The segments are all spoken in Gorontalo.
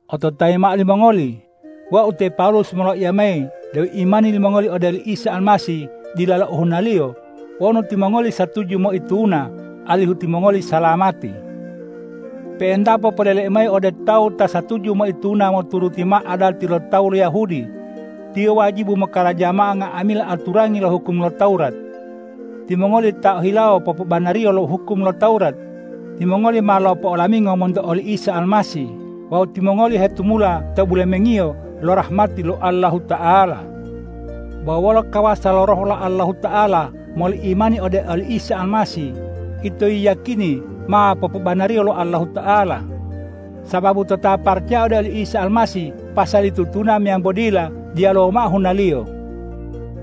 Ototayi mao limongoli, wau te Pawulus moloiya mayi deu imani limongoli ode oli Isa Almasih dilalo ohunaliyo wonu timongoli satuju moituna alihu timongoli salamati. Pe'entapo poleleu mayi ode tawu ta satuju moituna moturuti mao adati lo tawu lo Yahudi, tiyo wajibu mokaraja mao nga'amila aturangi lo hukum lo Tawurat. Timongoli ta ohilawo popobanariyo lo hukum lo Tawurat, timongoli ma lopo'olamingo monto oli Isa Almasih wawu timongoli hetumula to bulemengiyo lo rahmati lo Allahuta'ala. Bo wolo kawasa lo Roh lo Allahuta'ala moli imani ode oli Isa Almasih, ito yiyakini ma popobanariyo lo Allahuta'ala. Sababu to ta paracaya ode oli Isa Almasih pasali tutuna meyambo dila, diyaluwo mao hunaliyo.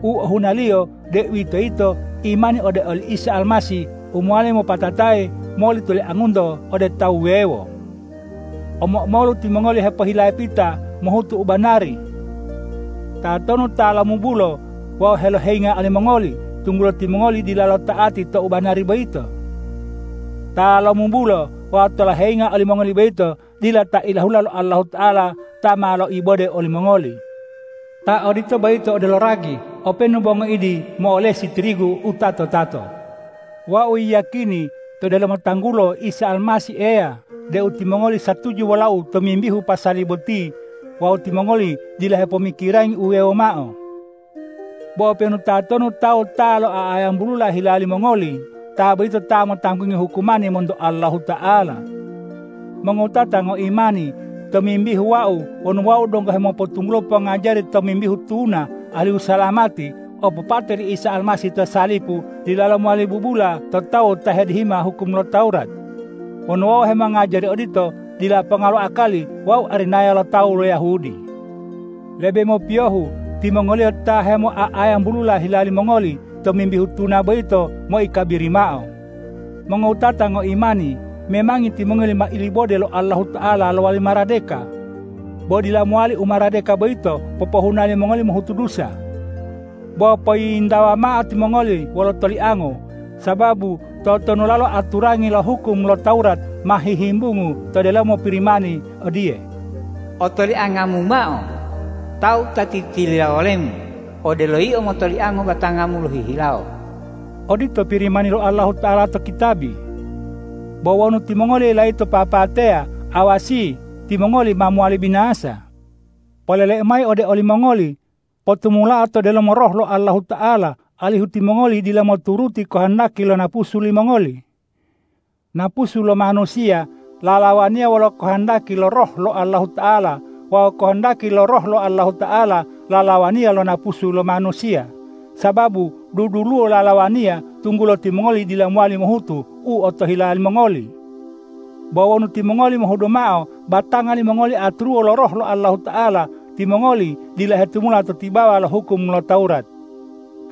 U ohunaliyo, deuwitoyito imani ode oli Isa Almasih u mowali mopatatayi moli toliangunto ode tawu wuwewo. Omo-omolu timongoli hepohilapita mohutu u banari. Tatonu ta lomubulo wawu heloheyinga olimongoli, tunggulo timongoli dilalo ta'ati to u banari boyito? Ta lomubulo wawu ta loheyinga olimongoli boyito dila ta ilahula lo Allahuta'ala ta ma loibode olimongoli. Ta odito boyito odelo ragi, openu bo ngoidi mo'olesi tirigu u tato-tato. Wau yiyakini to delomo tanggulo Isa Almasih Eya deu timongoli satuju wolau tomimbihu pasali boti wawu timongoli dila hepomikirangi u wuwewo mao. Bo openu tatonu tawu ta lo'oa'ayambulula hila limongoli, ta boyito ta motanggungi hukumani monto Allahuta'ala. Mongowutata ngoimani, tomimbihu wau wonu wau donggo hemopotunggulo pongajari tomimbihu tuna alihu salamati, opopate li Isa Almasih to salipu dilalo mowali bubula to tawu ta hedihima hukum lo Tawurat. Wonu wau hemongajari odito, dila ponga lo akali wau arinaya lo tawu lo Yahudi. Lebe mopiyohu timongoliyo ta hemo'oa'ayambulula hila limongoli tomimbihu tuna boyito moikabiri mao! Mongowutata ngoimani, memangi timongoli ma ilibode lo Allahuta'ala lowali maradeka. Bo dila mowali umaradeka boyito popohuna limongoli mohutu dusa. Bo poyiyintawa mao timongoli wolo toliango. Sababu totonulalo aturangi lo hukum lo Tawurat ma hihimbungu to delomo Pirimani odiye,”Otoliangamu mao tawu ta titiliya wolemu odelo yio motoliango batangamu lohihilawo.” Odito Pirimani lo Allahuta'ala to kitabi. Bo wonu timongoli layito papateya, awasi! Timongoli ma mowali binasa. Poleleu mayi ode olimongoli: Potumulao to delomo Roh lo Allahuta'ala, alihu timongoli dila moturuti kohondaki lo napusu limongoli. Napusu lo manusiya lalawaniya wolo kohondaki lo Roh lo Allahuta'ala wawu kohondaki lo Roh lo Allahuta'ala lalawaniya lo napusu lo manusiya, sababu duduluwo lalawaniya tunggulo timongoli dila mowali mohutu u otohila limongoli. Bo wonu timongoli mohudu mao batanga limongoli aturuwo lo Roh lo Allahuta'ala, timongoli dila hetumula to tibawa lo hukum lo Tawurat.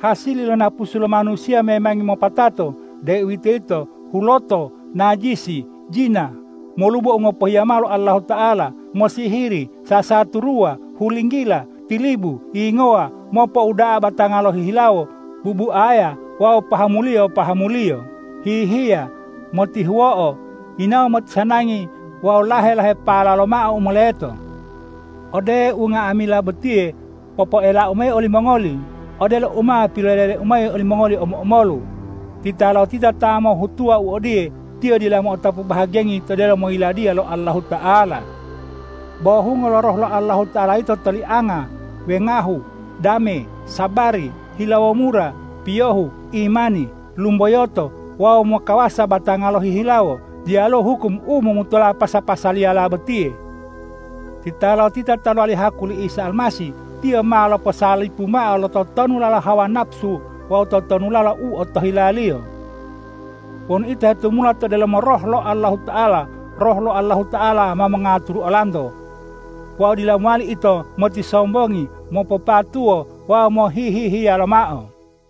Hasili lo napusu lo manusiya memangi ma mopatato, deuwitoyito huloto, najisi, jina, molubo u ngopohiya mao lo Allahuta'ala, mosihiri, sasaturuwa, hulinggila, tilibu, yingowa, mopouda'a batanga lohihilawo, bubuaya wawu pahamuliyo-pahamuliyo, hihiya, motihuwo'o, yinawo motisanangi wawu lahe-lahepa lomao u moleto. Ode unga'amila botiye popoelau mayi olimongoli odelo u ma pilopoelau mayi olimongoli omo-omolu: Titalotita ta hemolohutuwa u odiye, tiyo dila mo'otapu bahagiyangi to delomo Yiladiya lo Allahuta'ala. Bo hungo lo Roh lo Allahuta'ala yito tolianga, wengahu, dame, sabari, hilawo mura, piyohu, imani, lumboyoto wawu mokawasa batanga lohihilawo. Diyaluwo hukum u momutola pasa-pasaliyala botiye. Titalotita ta lowali haku li Isa Almasih, tiyo ma loposalipu mao lo totonulalo hawa napusu wawu totonulalo u otohilaliyo. Wonu ito hetumula to delomo Roh lo Allahuta'ala, Roh lo Allahuta'ala ma mongaturu olanto. Wawu dila mowali ito motisombongi, mopopatuwo wawu mohihihiya lomao.